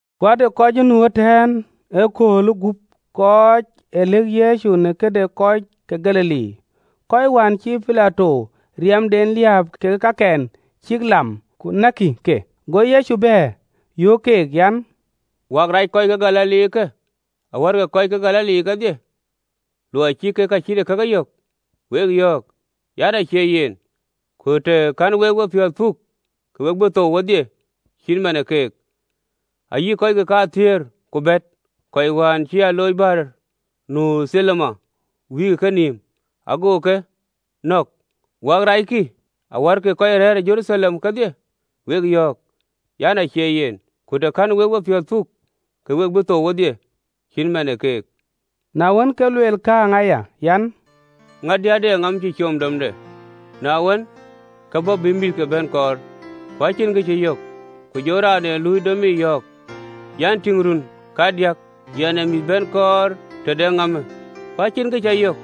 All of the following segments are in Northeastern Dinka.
Ku ade kɔc ë nu ëtɛ̈ɛ̈n ëköölë guöp kɔc ë lëk Yecu në këde kɔc ke Galili, kɔc wään cïï Pilato riɛmden liääp kekë kakɛn cïk lam ku näkkï ke. Go Yecu bɛ̈ɛ̈r, yöök keek an, “Në wek an rac kɔc ke Galilikë, awär kɔc ke Galili kedhie, luɔi cï kek ka cït ee kakë yök? Wek yɔ̈ɔ̈k an, acie yen, ku të kɛ̈n wek wepiɔ̈ɔ̈th puk, ke we bï thou wedhie cït man ë kek. Ayï kɔckë kathiëër ku bɛ̈t, kɔc wään cï aloocdïït bäär nu Thilowam wïïk ë kenïïm, ago ke nɔ̈k ë wek an rackï awär kɔc rɛ̈ɛ̈r ë Jeruthalem kedhie? Wek yɔ̈ɔ̈k an, acie yen, ku të kɛ̈n wek wepiɔ̈ɔ̈th puk, ke we bï thou wedhie cït man ë kek. Na wën, ke luel kääŋë aya an: “Ŋadï ade ŋaap cï com domde, na wën, ke bɔ̈ bï mïthke bɛ̈n kɔɔr, ku acïn kë cï yök. Ku jɔ raan ee luui domic yɔ̈ɔ̈k an, ‘Tïŋ, run kadiäk yɛn ee mïth bɛ̈n kɔɔr tëde ŋaapë, ku acïn kë cä yök,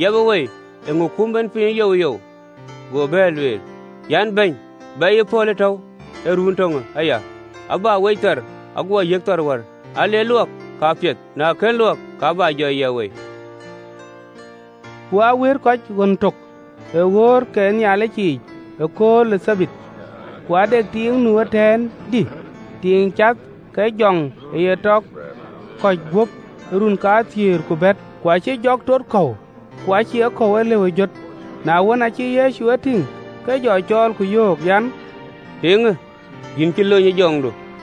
yiɛpë wei, eeŋö kum en piny youyou?’ Go bɛ̈ɛ̈r, lueel an, ‘Bɛ̈ny, bɛyë pɔ̈l atɔ̈u ë run töŋë aya, abä wec thar, aguɔ yiëk thar wär: aa le luɔk, ka piɛth: na kën luɔk, ka bä jɔ yiɛp wei.”’ Ku aa wëët kɔc ɣön tök ë ɣööt ke Nhialic yiic ëkööl ë Thabath. Ku ade tiiŋ nu ëtɛ̈ɛ̈n, dï, tiiŋ cath ke jɔŋ ë ye tɔ kɔ̈c guöp ë run kathiëër ku bɛ̈t, ku acïï jɔk tot kɔ̈u, ku acï ee kɔ̈u ë lëu ë jöt. Na wën, aacï Yecu ye tïŋ, ke jɔ cɔɔl, yöök an, “Tiiŋë, yïn cï lony ë jɔŋdu!”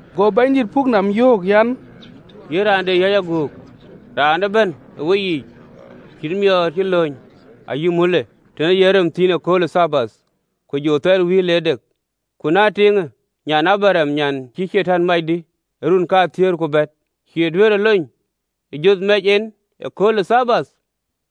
Go Bɛ̈nydït puk nɔm, yöök an, “Yïn raan de yäc aguk, raan ëbɛ̈n ë weyiic cïï thɔnde ë lony ayï mulde tën ee yen rem thïn ëkööl ë Thabath, ku jɔ thɛl wïïr le dek? Ku na tiiŋë, nyan ë Abraɣam, nyan cïï Catan mac, dï, ë run kathiëër ku bɛ̈t, cïï duëërë lony ë jonh mɛc en ëkööl ë Thabath?”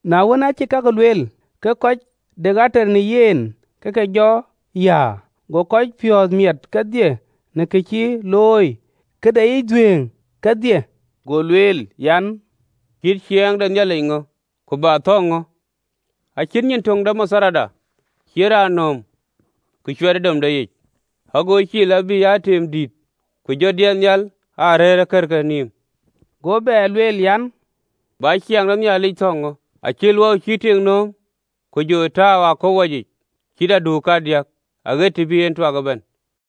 Na wën, aacï kakë lueel, ke kɔc de ater në yen ke ke jɔ yäär: go kɔc piɔ̈ɔ̈th miɛt kedhie në ka cï looi ka deyiic dhuëëŋ kedhie. Go lueel an, “Cït ciɛɛŋ de Nhialic ŋö? Ku bä thɔ̈ŋ ŋö? Acït nyin töŋ de matharda, cïï raan nööm, ku cuɛt ë domde yic, ago cil, abï aa tim dït, ku jɔ diɛt nhial aa rëër ë kërke nïïm.” Go bɛ lueel an, “Bä ciɛɛŋ de Nhialic thɔ̈ŋ ŋö? Acït luɔu cïï tik nööm, ku jɔ tääu ë aköp wacic, cït aduuk kadiäk, aɣet të bï en tuak ëbɛ̈n.”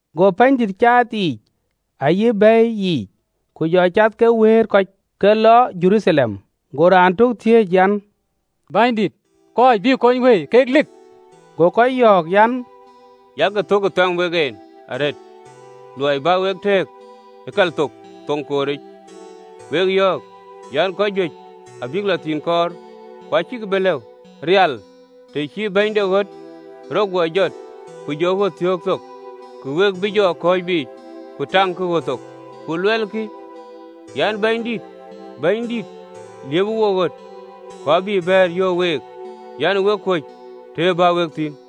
Go wuöt caath yiic ayï bɛ̈i yiic, ke jɔ cath ke wëët kɔc, ke lɔ Jeruthalem. Go raan tök thiëëc an, “Bɛ̈nydït, kɔc bï kony wëi, kek lik?” Go ke yɔ̈ɔ̈k an, “Yak cök ë thɛm wek en arëët luɔi bä wek tëëk ë kalthok thoŋ kooric: wek yɔ̈ɔ̈k an, kɔc juëc abïk lɔ thïn kɔɔr, ku acïkï bï lëu. Rial, të cï bɛ̈ny de ɣöt rɔt guɔ jɔt ku jɔ ɣöt thiöök thok, ku we bï jɔ kɔ̈ɔ̈c biic, ku taŋkï ɣöt thok, ku luɛlkï an, ‘Bɛ̈nydït, liëpë we ɣöt!’ Ku abï bɛ̈ɛ̈r, yöök week an, ‘Wek kuöc të bä wek thïn!’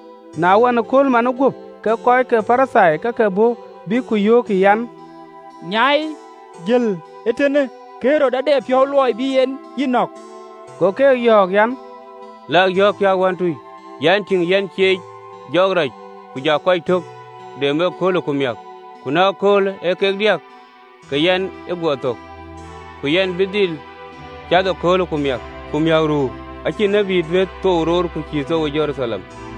Na ɣɔn, ëkööl manë guöp, ke kɔc kɔ̈k ë Parithai ke ke bɔ̈, bïk ku yöökkï an, “Nyai, jël ee tënë: Ɣerod ade piɔ̈u luɔi bï en yï nɔ̈k.” Go keek yɔ̈ɔ̈k an, “Lakï, yɔ̈ɔ̈kkï awantui an, ‘Tïŋ, yɛn ciec jɔɔk rac ku ja kɔc tɔ dem ëköölë ku miäk, ku na ëkööl ee kek diäk ke yɛn ë guɔ thök.’ Ku yɛn bï dhil cath ëköölë ku miäk ku miäk ruu: acïn tiët duëër thou roor ku cïï thou ë Jeruthalem.